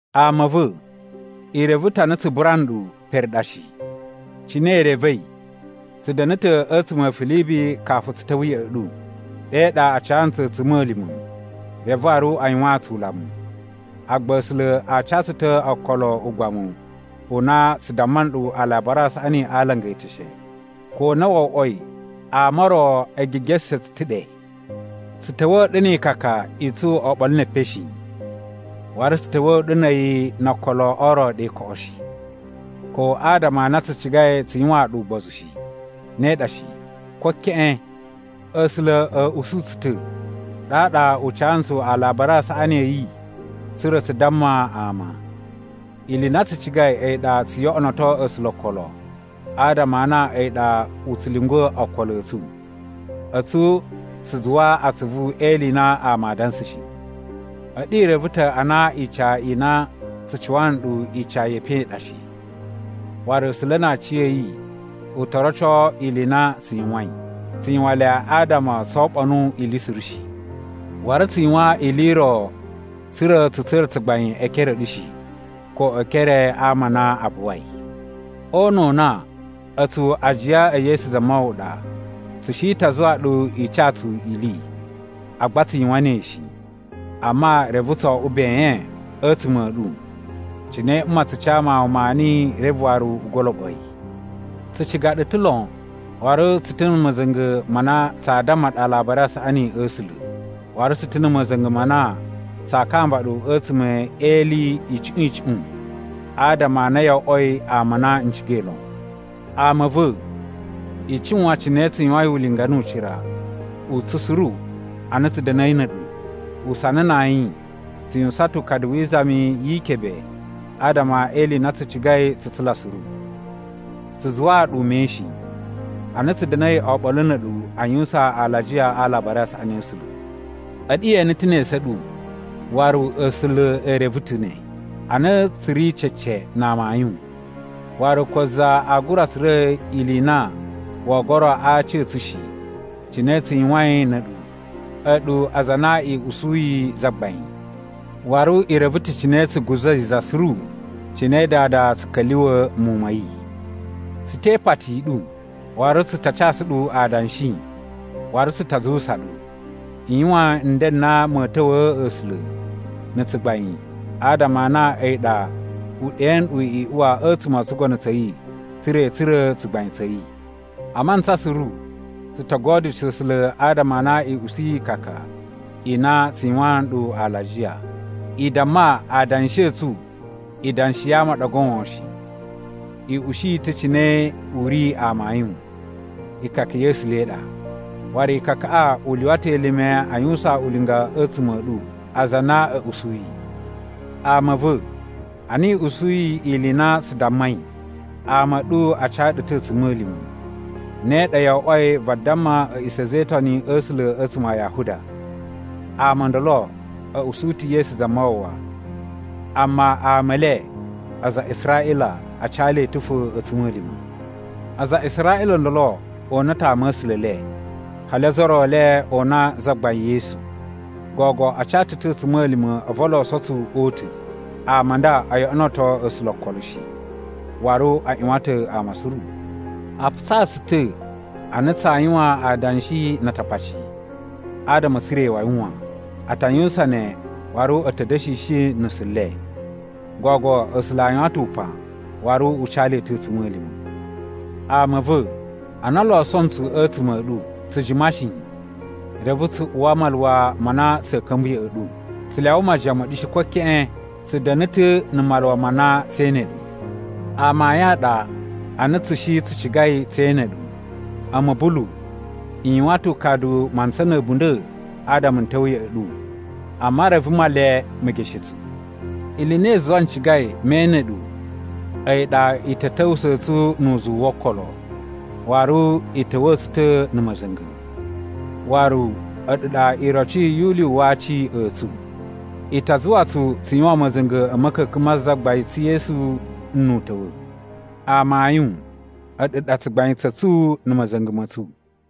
Ama a̱ va̱, i reve ta̱ ana tsu bura nɗu pere ɗa shi. Cine i revei, tsu da̱na̱ ta̱ a̱tsuma̱ a̱ Filibi kafu tsu ta̱wa̱ ya̱ꞌa̱ ɗu. Ɗe ɗa a ca ntsu a̱tsuma̱lima̱ reve waru a yuwaan tsu ulamu. Agba A̱sula̱ a ca tsu ta̱ okolo o ugbamu u na tsu damma nɗu Alabari a Saꞌani a alanga e eteshe, ko na wo oꞌwoi ama o ro e gigeshe tsu ta̱ ɗe. Tsu ta̱wa̱a̱ ɗu ni ikaka i tsu oɓolo ne epen shi. Waru tsu ta̱wa̱a̱ ɗu na̱ a̱yi no okolo o ro ɗe koꞌo shi, ko adama a na tsu cigai tsu yuwaan ɗu ugbozu shi. Ne ɗa shi, ko keꞌen! A̱sula̱ a̱ usu tsu ta̱, ɗaɗa u ca ntsu Alabari a Saꞌani a̱ yi tsa̱ra̱ tsu damma ama. Ili i na tsu cigai a̱yi ɗa tsu yoꞌonoto A̱sula̱ o okolo adama a na a̱yi ɗa u tsu lyungwa̱ okolo a̱ tsu. A̱tsu tsu zuwa atsuvu e ili i na ama a dansa shi. A̱ɗu i reve ta̱ a na ica i na tsu cuwa nɗu ica ye epen i ɗa shi, waru A̱sula̱ na aciya̱yi u to roco ili i na tsu yuwain, tsu yuwan le adama tso oɓonu ili suru shi. Waru tsu yuwan ili i ro tsa̱ra̱ tsu tsura̱ tsugbain e ekere a̱ ɗu shi, ko e ekere a ama a na a buwai. O una̱ u na, a̱tsu ajiya e Yesu Zamawawa ɗa, tsu shi ta zuwa ɗu i ca tsu ili. Agba tsu yuwan ne shi, amma, reve tso oꞌwo ben a̱tsuma̱ a̱ ɗu cine mma tsu ca mawun maani reve waru u goloɓo yi. Tsu ciga ɗu ta̱ lon, waru tsu ta̱ na̱ ma̱za̱nga̱ ma na tsaa damma ɗu Alabari a Saꞌani a̱ A̱sula̱. Waru tsu ta̱ na̱ ma̱za̱nga̱ ma na tsaa kamba ɗu a̱tsuma̱ e ili icuꞌun icuꞌun, adama a na yo oꞌwoi ama a na n cigai lon. Ama a̱ va̱, i cuwan cine tsu yuwain ulinga nu ucira u tsu suru ana tsu da̱na̱i na̱ a̱ɗu. Usana na ayin tsu yuwusan ta̱ ukadu wi izami yi ikebe adama e ili i na tsu cigai tsu tsula suru. Tsu zuwaa ɗu ume shi, ana tsu da̱na̱i oɓolo na̱ a̱ɗu a yuwusan alajiya a Alabari a Saꞌani a̱ A̱sula̱. A̱ɗu ye ene ta̱ ne esu a̱ ɗu, waru A̱sula̱ e reve ta̱ ne, a na tsu ri cece na amayun, waru ko za aa gura tsura̱ ili i na woo goro a aci a̱ tsu shi cine tsu yuwain na̱ a̱ɗu, a̱ɗu aza a na i usuyi Zagbain. Waru i reve ta̱ cine tsu guza̱i za suru cine dada tsu ka̱lyuwa̱ muwun ma̱ yi. Tsu te ipati i ɗu, waru tsu ta casu ɗu adanshi, waru tsu ta zuwusa ɗu, i yuwan nden n na ma̱a̱ ta̱wa̱a̱ A̱sula̱ na̱ tsugbain adama a na a̱yi ɗa u ɗe nɗu i uwa a̱tsuma̱ o tsugono tsa̱ yi tsa̱ra̱ i tsura̱ tsugbain tsa̱ yi. A mantsa suru tsu to godyusho A̱sula̱ adama a na i usuyi ikaka i na tsu yuwaan nɗu alajiya. I damma adanshi a̱ tsu idanshi ya ama a ɗa goon shi. I ushi yi ta̱ cine u ri amayun. Ikaka ya̱ A̱sula̱ i ɗa. Waru ikakaꞌa i lyuwa ta̱ elime a yuwusan ulinga a̱tsuma̱ a̱ ɗu aza a na a̱ usuyi. Ama a̱ va̱, ana i usuyi ili i na tsu dammai, ama a̱ ɗu a ca ɗu ta̱ a̱tsuma̱lima̱. Ne ɗa yo oꞌwoi vadamma a̱ꞌisa̱ a̱za̱ e Itoni a̱ A̱sula̱ a̱tsuma̱ a Yahuda. Ama o ndolo a̱ usu ta̱ Yesu Zamawawa, amma ama e le, aza a Israꞌila, a ca le ta̱ fo a̱tsuma̱lima̱. Aza a Israꞌila o ndolo o una ta̱ ama̱sula̱ e le, hali ozo o ro e le o una Zagbain Yesu. Gogo a ca tsu ta̱ a̱tsuma̱lima̱ a̱vu o loso tsu o uta̱. Ama a nda o yoꞌonoto A̱sula̱ okolo shi, waru a ꞌyuwan ta̱ ama suru. A putsa tsu ta̱ a na tsaa yuwan adanshi na Atakpaci, adama a̱ tsura̱ iwawi wan. A ta yuwusan ne waru a̱ ta̱ da̱shishi nusu le. Gogo A̱sula̱ a yuwan ta̱ upan waru u ca le ta̱ a̱tsuma̱lima̱. Ama a̱ va̱, ana o loso ntsu a̱tsuma̱ a̱ ɗu, tsu jima shi, reve tsu uwa maluwa ma na tsa̱a̱ ka̱mba̱ ya̱ꞌa̱ ɗu. Tsu lyawa majiyan ma̱ ɗu shi, ko keꞌen, tsu da̱na̱ ta̱ na̱ maluwa ma na tsee ene ɗu. Amayun a ɗa a na tsu shi tsu cigai tse ene ɗu, a̱mu Bulu, n yuwan ta̱ ukadu mantsa na̱ a̱bunda̱ adama n ta̱wa̱ ya̱ꞌa̱ ɗu, amma reve Male me geshe tsu. Ili i na i zuwai n cigai me ene ɗu a̱yi ɗa i ta̱ ta̱wusa̱ tsu nu uzuwu wo okolo, waru i ta̱wa̱a̱ tsu ta̱ na̱ ma̱za̱nga̱, waru a̱ɗu ɗa iroci yu ulyuwu wa aci a̱ tsu. I ta zuwa tsu tsu yuwan ma̱za̱nga̱ a̱ ma̱ka̱ka̱n ma Zagbain tsu Yesu nnu u ta̱wa̱. Amayun, a̱ɗu ɗa tsugbain tsa̱ tsu na̱ ma̱za̱nga̱ ma̱ tsu.